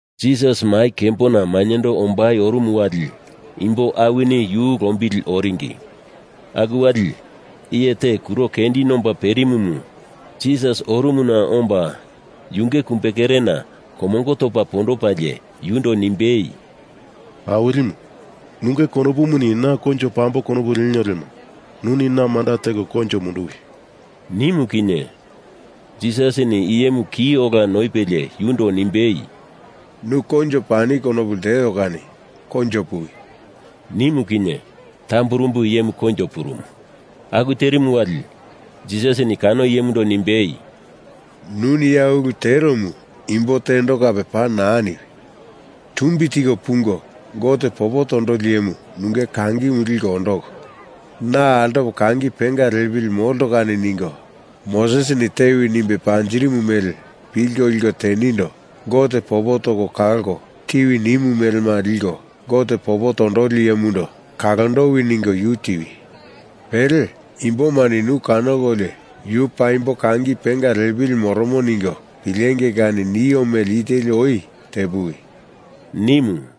Jisas mai kembona mainyendo ombai orumu wali imbo awini yu lombili oringi. Aku wali iye te kuro kendi nomba perimumu Jisas orumuna omba yunge kumbekerena komongo topa pondopalie yundo nimbei, “Awilimu, nunge konopumuni na koinjo pambo konopu lienio lemo nuni na manda teko koinjo munduwi,” nimu kinye, Jisasini iyemu ki ola noipelie yundo nimbei, “Nu koinjo pani konopu lteo kani koinjo puwi,” nimu kinye tamburumbu iyemu koinjo purumu. Aku terimu wali Jisasini kano iyemundo nimbei, “Nuni ya ulu teromu imbo tendo kape paa naa niwi. Tumbi tiko pungo Gote popo tondoli iyemu nunge kangimu liko ondoko, na altopo kangi penga liepili molto kani ningo Mosesini tewi nimbe panjirimu mele pilko liko tenindo Gote popo toko kalko tiwi nimu melemu liko Gote popo tondoli iyemundo kalondowi ningo yu tiwi. Pele imbomani nu kanokolio yu paimbo kangi penga liepili moromo ningo pilengei kani nio mele i teli oi tepuwi,” nimu.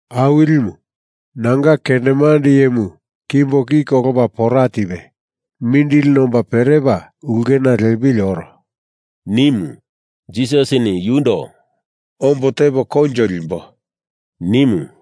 “Awilimu, nanga kendemande iyemu kimbo ki kolopa pora tipe mindili nomba perepa ulkena liepili oro,” nimu. Jisasini yundo “Ombo tepo koinjo limbo,” nimu.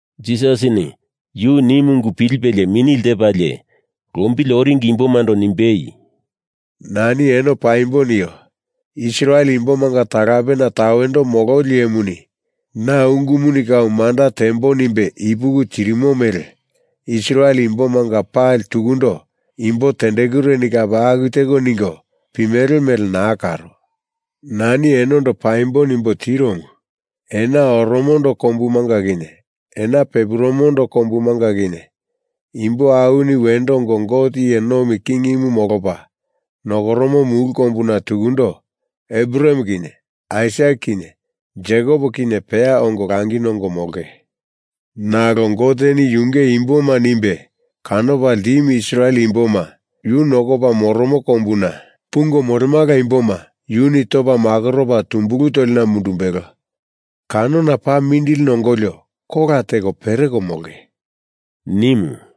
Jisasini yu nimu ungu pilipelie mini lepalie lombili oringi imbomando nimbei, “Nani eno paimbo nio. Israel imbomanga talapena tawendo mololi iyemuni na ungumuni kau manda tembo nimbe ipuki tirimo mele Israel imbomanga pali tukundo imbo tendekureni kape aku teko ningo pimele mele naa karo. Nani enondo paimbo nimbo tiromu, Ena oromondo kombumanga kinye ena pepurumondo kombumanga kinye imbo awini wendo ongo Gote iye nomi kingimu molopa nokoromo mulu kombuna tukundo Abraham kinye Aisak kinye Jekop kinye peya ongo langi nongo molonge. Nalo Goteni yunge imboma nimbe kanopa ltimu Israel imboma yu nokopa moromo kombuna pungo molemala imboma yuni topa makoropa tumbulu tolina mundumbelo. Kanona paa mindili nongolio kola teko pereko molonge,” nimu.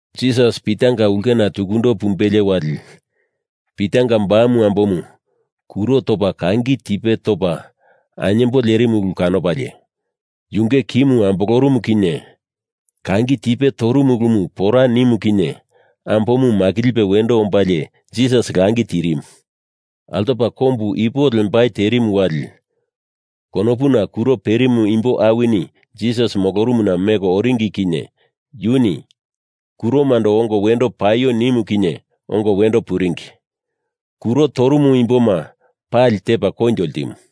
Jisas Pitanga ulkena tukundo pumbelie wali, Pitanga bamu ambomu kuro topa kangi tipe topa ainyembo lerimu ulu kanopalie, yunge kimu ambolorumu kinye kangi tipe toromu ulumu pora nimu kinye ambomu makilipe wendo ombalie Jisas langi tirimu. Altopa kombu ipu lembai terimu wali konopuna kuro perimu imbo awini Jisas molorumuna meko oringi kinye yuni kuromando ongo wendo paio nimu kinye ongo wendo puringi. Kuro torumu imboma pali tepa koinjo ltimu.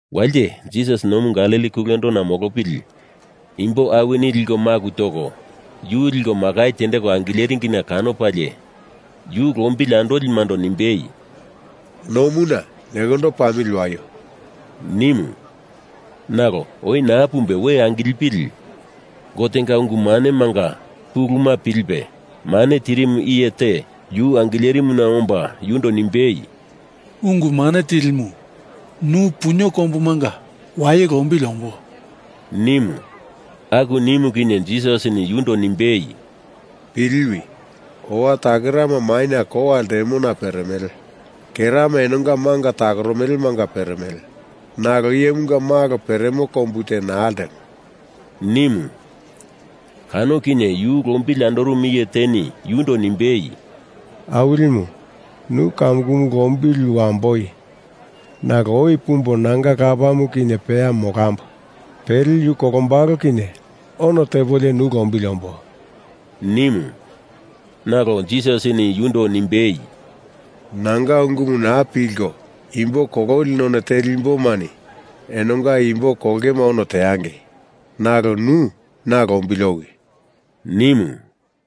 Walite Jisas nomu Galili kulendona molopili imbo awini liko maku toko yu liko makai tendeko angileringina kanopalie yu lombili andolimando nimbei, “Nomuna nekondo pamili waio,” nimu. Nalo oi naa pumbe we angilipili Gotenga ungu manemanga puluma pilipe mane tirimu iye te yu angilerimuna omba yundo nimbei, “Ungu Mane Tilimu, nu punio kombumanga waye lombili ombo,” nimu. Aku nimu kinye Jisasini yundo nimbei, “Piliwi! Owa takerama maina kowa ltemona peremele. Kerama enonga manga takoromelemanga peremele. Nalo Iyemunga Malo peremo kombu te naa ltemo,” nimu. Kano kinye yu lombili andorumu iye teni yundo nimbei, “Awilimu, nu kamukumu lombili wamboi nalo oi pumbo nanga lapamu kinye peya molambo. Pele yu kolombalo kinye ono tepolio nu lombili ombo,” nimu. Nalo Jisasini yundo nimbei, “Nanga ungumu naa pilko imbo kololi none teli imbomani enongano imbo kolongema ono teangei. Nalo nu na lombili owi,” nimu.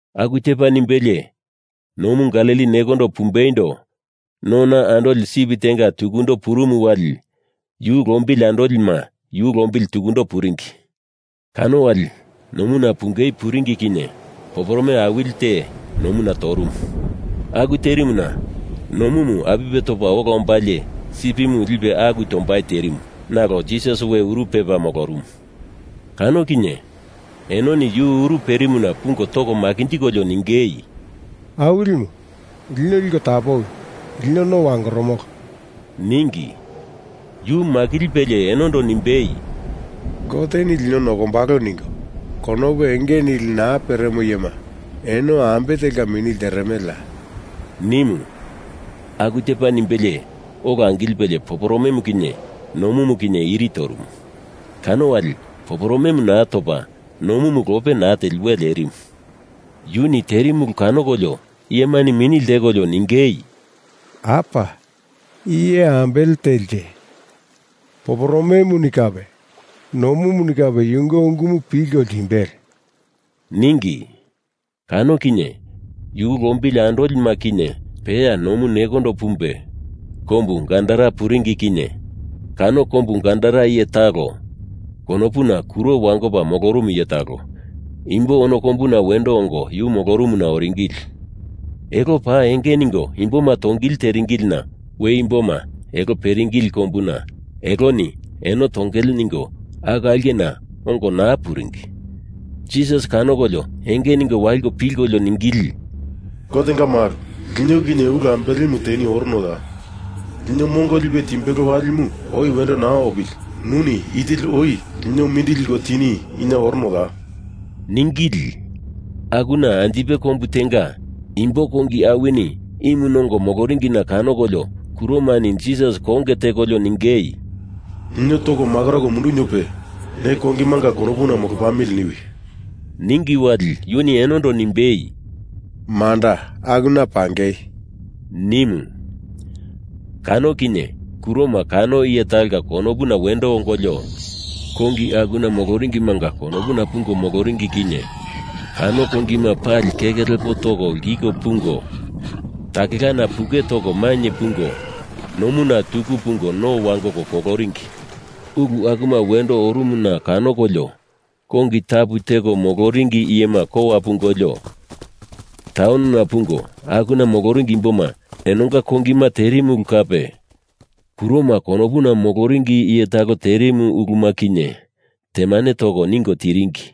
Aku tepa nimbelie nomu Galili nekondo pumbeindo nona andoli sip tenga tukundo purumu wali yu lombili andolima yu lombili tukundo puringi. Kano wali nomuna pungei puringi kinye poporome awili te nomuna torumu. Aku terimuna nomumu apipe topa ola ombalie sipimu lipe aku tombai terimu nalo Jisas we uru pepa molorumu. Kano kinye enoni yu uru perimuna pungo toko makinjikolio ningei, “Awilimu, lino liko tapowi. Lino no wangoromolo,” ningi. Yu makilipelie enondo nimbei, “Goteni lino nokombalo ningo konopu enge nili naa peremo iyema, eno ambe telka mini lteremeleya?” nimu. Aku tepa nimbelie ola angilipe poporomemu kinye nomumu kinye iri torumu. Kano wali poporome naa topa nomumu lope naa teli we lerimu. Yuni terimu ulu kanokolio iyemani mini ltekolio ningei, “Apa! I iye ambele telinje? Poporomemuni kape nomumuni kape yunge ungumu pilko ltimbele,” ningi. Kano kinye yu lombili andolima kinye peya nomu nekondo pumbe kombu Gadara puringi kinye kano kombu Gadara iye talo, konopuna kuro wangopa molorumu iye talo, imbo ono kombuna wendo ongo yu molorumuna oringili. Elo paa enge ningo imboma tongili teringilina we imboma elo peringili kombuna eloni eno tongele ningo aku aulkena ongo naa puringi. Jisas kanokolio enge ningo waliko pilkolio ningili, “Gotenga Malo, lino kinye ulu ambelemu teni oronoya? Lino mongo lipe timbelo walimu oi wendo naa opili nuni i teli oi lino mindili liko tini ina oronoya?” ningili. Akuna anjipe kombu tenga imbo kongi awini imu nongo moloringina kanokolio kuromani Jisas konge tekolio ningei, “Lino toko makoroko munduniope ne kongimanga konopuna molo pamili niwi,” ningi wali yuni enondo nimbei, “Manda, akuna pangei,” nimu. Kano kinye kuroma kano iye talonga konopuna wendo ongolio kongi akuna moloringimanga konopuna pungo moloringi kinye kano kongima pali keke lepo toko lkiko pungo takelana puke toko mainye pungo nomuna tuku pungo no wangoko koloringi. Ulu akuma wendo orumuna kanokolio kongi tapu teko moloringi iyema kowa pungolio, taunona pungo akuna moloringi imboma enonga kongima terimu ulu kape kuroma konopuna moloringi iye talo terimu uluma kinye temane toko ningo tiringi.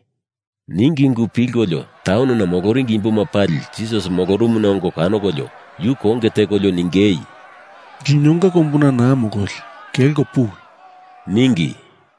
Ningi ungu pilkolio taunona moloringi imboma pali Jisas molorumuna ongo kanokolio yu konge tekolio ningei, “Linonga kombuna naa mololi, kelko puwi,” ningi.